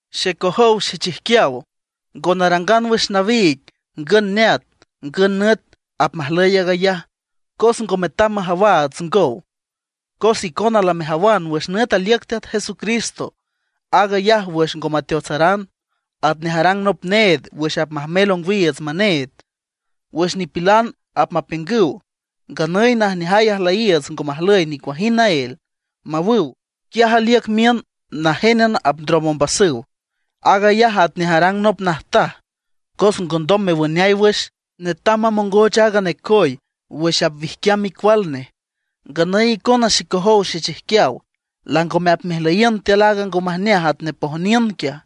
Xecojow xechijquiaw, ngo narangan wüx nawiig ngün neat ngün nüt apmajlüy aag ayaj, cos ngo metam majawaats ngow. Cos icona lamejawan wüx nüt aliüc Teat Jesucristo, aag ayaj wüx ngo mateotsaran, atnej arang nop need wüx apmajmel ongwiiüts maneed. Wüx nipilan apmapiüngüw: “Nganüy najneajay ajlüyiiüts ngo majlüy nicuajind naél”, mawüw, quiaj aliüc miün najénan apndrom ombasüw. Aag ayaj atnej arang nop najtaj, cos ngondom mewüneay wüx, netam mamongoch aaga necoy wüx apwijquiam micual nej. Nganüy icona xecojow xechijquiaw, langome apmejlüyiün tiül aaga ngo majneaj atnej pojniün quiaj.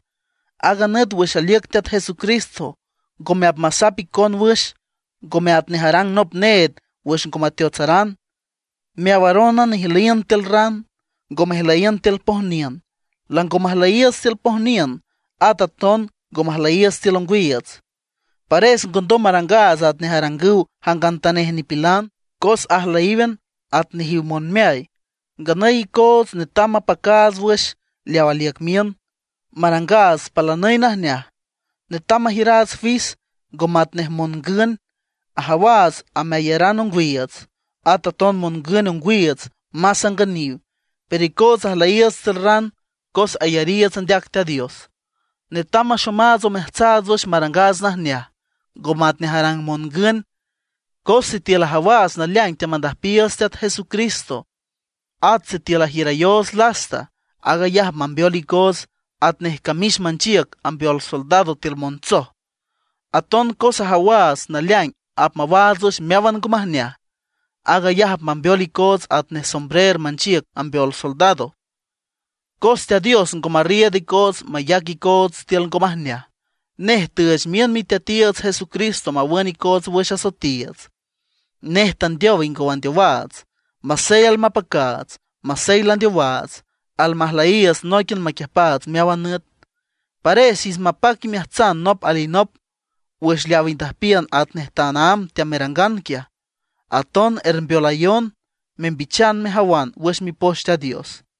Aaga nüt wüx aliüc Teat Jesucristo ngome apmasap icon wüx, ngome atnej arang nop need wüx ngo mateotsaran. Meawarónan ijlüyiün tiül ran, ngo mejlüyiün tiül pojniün. Lango majlüyiiüts tiül pojniün, at aton ngo majlüyiiüts tiül ongwiiüts. Pares ngondom marangaats atnej arangüw jangantanej nipilan, cos ajlüyíwan at nejiw monmeay. Nganüy icoots netam mapacaats wüx leaw aliüc miün, marangaats palanüy najneaj. Netam majiüraats fis, ngo matnej mongün. Ajawaats ameayaran ongwiiüts. At aton mongün ongwiiüts más angüniw. Pero icootsa ajlüyiiüts tiül ran, cos ayariiüts andeac Teat Dios. Netam maxomaats omeajtsaats wüx marangaats najneaj, ngo matnej arang mongün. Cos sitiül ajawaats naleaing teamandüjpiiüts Teat Jesucristo, at sitiül ajiürayoots lasta, aag ayaj apmambeol icoots atnej camix manchiüc ambeol soldados tiül montsoj. Aton cos ajawaats naleaing apmawaats wüx meáwan ngo majneaj; aag ayaj apmambeol icoots atnej sombrer manchiüc ambeol soldados. Cos Teat Dios ngo marriiüd icoots mayac icoots tiül ngo majneaj, nej tüüch miün Miteatiiüts Jesucristo mawün icoots wüx asoetiiüts. Nej tandeow ingow andeowaats. Masey almapacaats masey landeowaats, almajlüyiiüts nóiquian maquiüjpaats meáwan nüt. Pares ich mapac imeajtsan nop alinop wüx leaw indüjpiün atnej tanaámb teamerangan quiaj. Aton ermbeolayon membichan mejawan wüx Mipoch Teat Dios.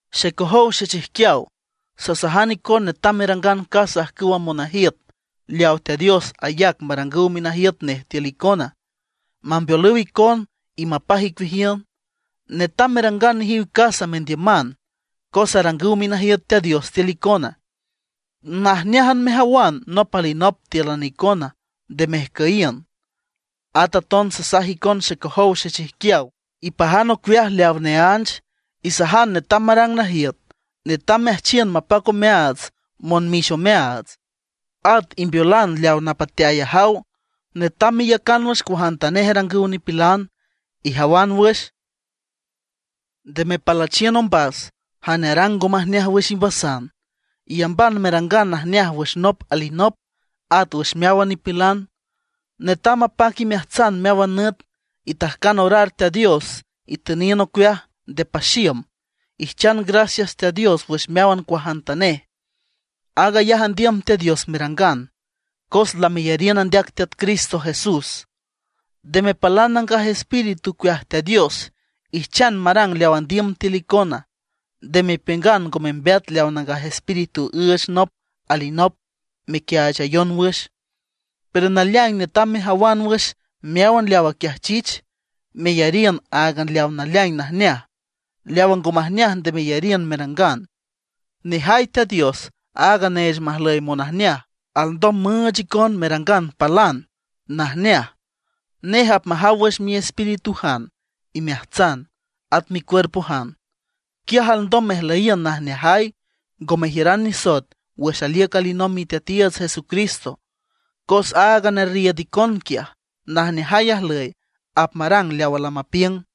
Xecojow xechijquiaw, sasajan icon netam merangan casa ajcüwa monajiüt leaw Teat Dios ayac marangüw minajiüt nej tiül icona, mambeolüw icon y mapaj icueajiün. Netam merangan nejiw casa mendiüman, cos arangüw minajiüt Teat Dios tiül icona; najneájan mejawan nop alinop tíülan icona, nde mejcüyiün. At aton sasajan icon xecojow xechijquiaw, ipajan ocueaj leaw neánch, isajan netam marang najiüt. Netam meajchiün mapac omeaats monmix omeaats, at imbeolan leaw napateay ajaw. Netam meiücan wüx cuajantanej arangüw nipilan. Ijawan wüx, nde mepalüchiün ombas jane arang ngo majneaj wüx imbasan, iyamban merangan najneaj wüx nop alinop, at wüx meáwan nipilan. Netam mapac imeajtsan meáwan nüt. Itajcan orar Teat Dios, itüniün ocueaj, nde paxiüm. Ijchan gracias Teat Dios wüx meáwan cuajantanej. Aag ayaj andiüm Teat Dios merangan, cos lameyariün andeac Teat Cristo Jesús. Nde mepalan Nangaj Espíritu ocueaj Teat Dios; ijchan marang leaw andiüm tiül icona. Nde mepiüngan ngo membeat leaw Nangaj Espíritu üüch nop alinop mequiaachayon wüx. Pero naleaing netam mejawan wüx meáwan leaw aquiajchich, meyariün áagan leaw naleaing najneaj. Leawa ngo majneaj nde meyariün merangan. Nejay Teat Dios, aaga neech majlüy monajneaj, alndom müüch icon merangan palan najneaj. Nej apmajaw wüx miespíritujan, imeajtsan, at micuerpojan. Quiaj alndom mejlüyiün najneajay, ngo mejiüran nisoet wüx aliüc alinomb Miteatiiüts Jesucristo. Cos aaga nerriiüd icon quiaj, najneajay ajlüy, apmarang leawa lamapiüng.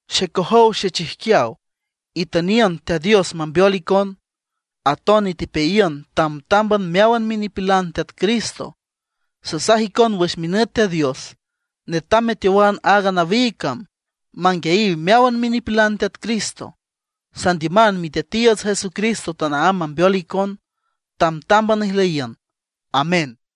Xecojow xechijquiaw, itüniün Teat Dios mambeol xicon. Aton itepeayiün tamtámban meáwan minipilan Teat Cristo. Sasaj icon wüx minüt Teat Dios, netam meteowan aaga nawiig cam manguiayiw meáwan minipilan Teat Cristo. Sandiüman Miteatiiüts Jesucristo tanaámb mambeol icon, tambtámban ijlüyiün. Amén.